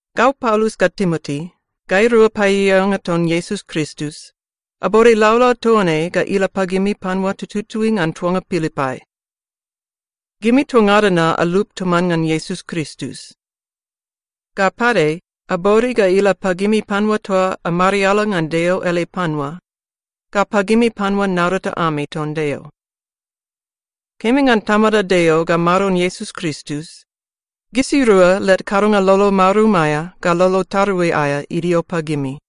Gau Paulus ga Timoti, gairua paeaeanga ton Iesus Kristus, abode laulau toa ne ga ila pagimi panua tututui ngan tuanga Pilipai. Gimi toa ngada na alup toman ngan Iesus Kristus. Ga pade, abode ga ila pagimi panua toa amariala ngan Deo ele panua ga pagimi panua naurata ami ton Deo. Kemi ngan Tamada Deo ga Maron Iesus Kristus, gisirua led kadonga lolo marum aea ga lolo tarui aea idio pagimi.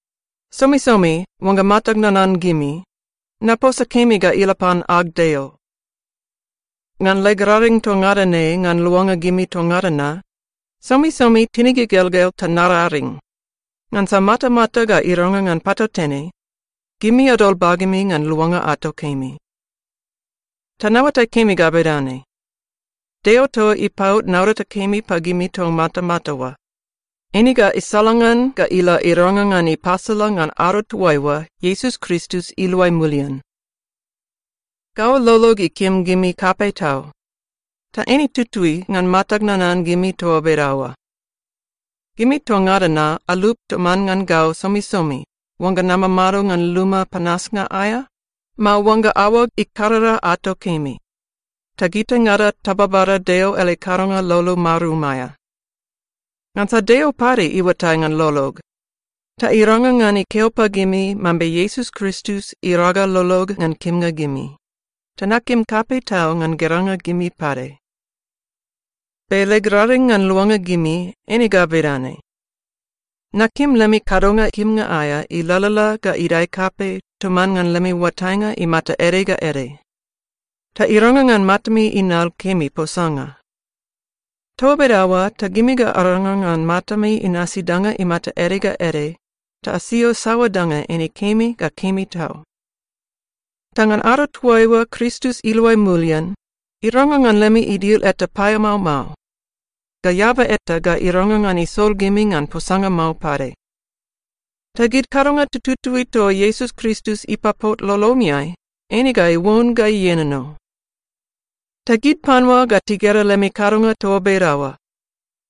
Somisomi oangga matag nanan gimi, naposa kemi ga ila pan ag Deo. Ngan leg raring toa ngada ne ngan luanga gimi toa ngada na, somisomi tinig igelgel ta nararing, ngansa matamata ga irangrang ngan patautene, gimi adol bagemi ngan luanga ato kemi. Ta naoatai kemi ga bedane: Deo toa ipaot naurata kemi pagimi toa matamata oa, eine ga isalangan ga ila irangrang ngan ipasala ngan ado toaiua Iesus Kristus iluai mulian. Gau lolog ikim gimi kapei tau, ta eine tutui ngan matag nanan gimi toa bedaoa. Gimi toa ngada na alup toman ngan gau somisomi oangga namamado ngan luma panasnga aea, mao oangga aoag ikarara ato kemi, ta gitaingada tababada Deo ele kadonga lolo marum aea. Ngansa Deo pade iuatai ngan lolog, ta irangrang ngan ikeo pagimi mambe Iesus Kristus iraga lolog ngan kimnga gimi, ta nakim kapei tau ngan geranga gimi pade. Be leg raring ngan luanga gimi eine ga bedane: Nakim lemi kadonga kimnga aea ilalala ga idae kapei toman ngan lemi oatainga imata ede ga ede. Ta irangrang ngan matami inal kemi posanga. Toa bedaoa ta gimi ga arangrang ngan matami inasi danga imata ede ga ede ta asio saoa danga eine kemi ga kemi tau. Ta ngan ado toaiua Kristus iluai mulian, irangrang ngan lemi idil eta paeamao mao, ga eaba eta ga irangrang ngan isol gimi ngan posanga mao pade. Ta gid kadonga tututui toa Iesus Kristus ipapot lolomiai, eine ga iuon ga ienono. Ta gid panua ga tigera lemi kadonga toa bedaoa,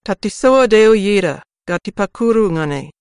ta tisoa Deo ieda ga tipakuru ngan ei.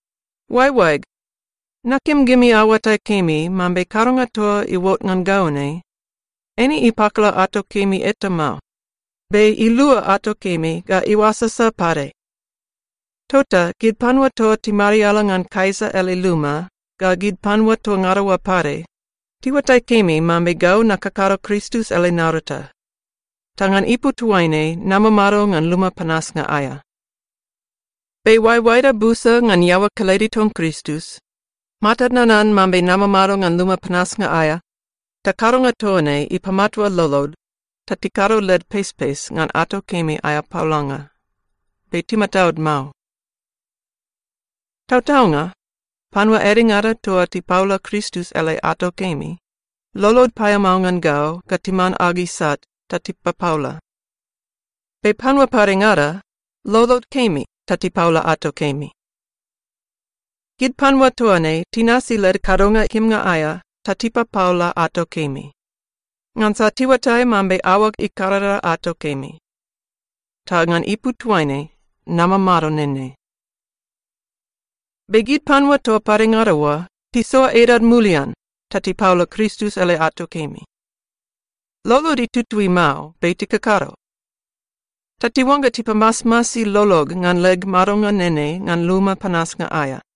Oaeoaeg, nakim gimi aoatai kemi mambe kadonga toa iuot ngan gau ne, eine ipakala ato kemi eta mao, be ilua ato kemi ga iuasasa pade. Tota gid panua toa timariala ngan Kaisa ele luma ga gid panua toa ngada oa pade, tiuatai kemi mambe gau nakakado Kristus ele naurata, ta ngan ipu toaine namamado ngan luma panasnga aea. Be oaeoaeda busa ngan iaoa kelede ton Kristus, matad nanan mambe namamado ngan luma panasnga aea, ta kadonga toa ne ipamatua lolod ta tikado led pespes ngan ato kemi aea paolanga, be timataud mao. Tautaunga, panua edengada toa tipaola Kristus ele ato kemi, lolod paeamao ngan gau ga timan ag isat ta tipapaola. Be panua padengada, lolod kemi ta tipaola ato kemi. Gid panua toa ne tinasi led kadonga kimnga aea ta tipapaola ato kemi, ngansa tiuatai mambe aoag ikarara ato kemi, ta ngan ipu toaine namamado nene. Be gid panua toa padengada oa tisoa edad mulian ta tipaola Kristus ele ato kemi. Lolod itutui mao, be tikakado. Ta tiuangga tipamasmasi lolog ngan leg madonga nene ngan luma panasnga aea.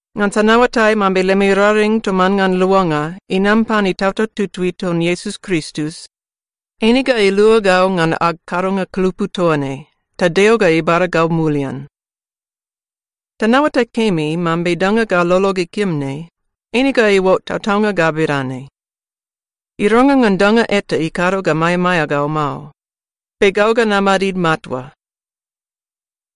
ngansa naoatai mambe lemi raring toman ngan luanga inam pan Itautau Tutui ton Iesus Kristus, eine ga ilua gau ngan ag kadonga kulupu toa ne, ta Deo ga ibada gau mulian. Ta naoatai kemi mambe danga ga lolog ikim ne, eine ga iuot tautaunga ga bedane: Irangrang ngan danga eta ikado ga maeamaea gau mao, be gau ga namadid matua.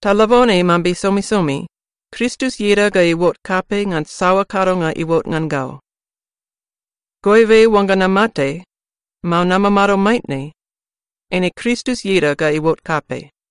Ta labone mambe somisomi, Kristus ieda ga iuot kapei ngan saoa kadonga iuot ngan gau. Goibe oangga namate, mao namamado maitne, eine Kristus ieda ga iuot kapei.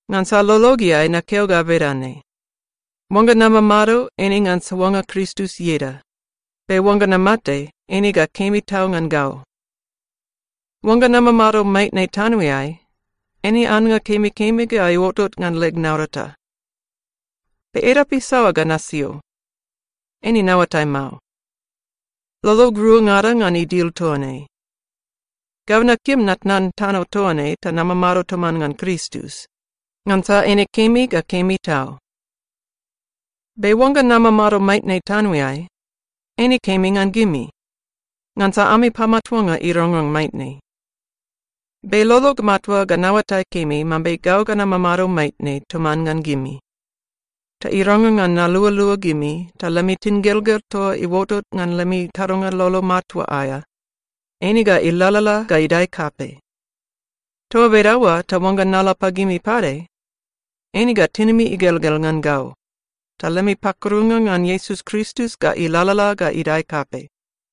Ngansa lologeai nakeo ga bedane: Oangga namamado, eine ngan soanga Kristus ieda, be oangga namate, eine ga kemi tau ngan gau. Oangga namamado maitne tanoeai, eine annga kemikemi ga iuotot ngan leg naurata. Be edap isaoa ga nasio? Eine naoatai mao. Lolog ruangada ngan idil toa ne. Gau nakim natnan tano toa ne ta namamado toman ngan Kristus, ngansa eine kemi ga kemi tau. Be oangga namamado maitne tanoeai, eine kemi ngan gimi, ngansa ami pamatuanga irangrang maitne. Be lolog matua ga naoatai kemi mambe gau ga namamado maitne toman ngan gimi, ta irangrang ngan nalualua gimi ta lemi tingelgel toa iuotot ngan lemi kadonga lolo matua aea, eine ga ilalala ga idae kapei. Toa bedaoa ta oangga nala pagimi pade, eine ga tinimi igelgel ngan gau, ta lemi pakurunga ngan Iesus Kristus ga ilalala ga idae kapei.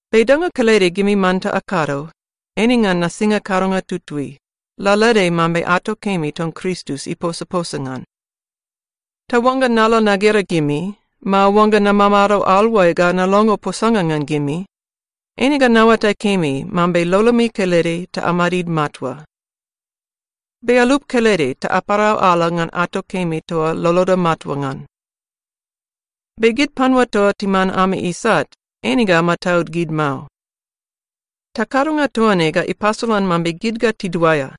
Be danga kelede gimi manta akado, eine ngan nasinga kadonga tutui, lalaede mambe ato kemi ton Kristus iposaposa ngan. Ta oangga nala nagera gimi, mao oangga namamado aluai ga nalongo posanga ngan gimi, eine ga naoatai kemi mambe lolomi kelede ta amadid matua. Be alup kelede ta aparau ala ngan ato kemi toa loloda matua ngan. Be gid panua toa timan ami isat, eine ga amataud gid mao. Ta kadonga toa ne ga ipasolan mambe gid ga tiduaea,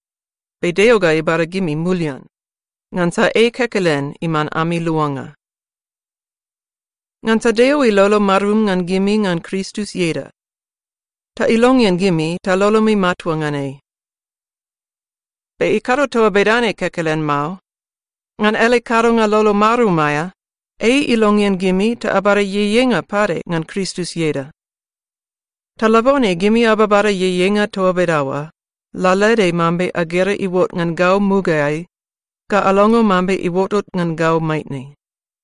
be Deo ga ibada gimi mulian, ngansa ei kekelen iman ami luanga. Ngansa Deo ilolo marum ngan gimi ngan Kristus ieda, ta ilongean gimi ta lolomi matua ngan ei. Be ikado toa bedane kekelen mao. Ngan ele kadonga lolo marum aea, ei ilongean gimi ta abada ieieinga pade ngan Kristus ieda. Ta labone gimi ababada ieieinga toa bedaoa, lalaede mambe agera iuot ngan gau mugaeai ga alongo mambe iuotot ngan gau maitne.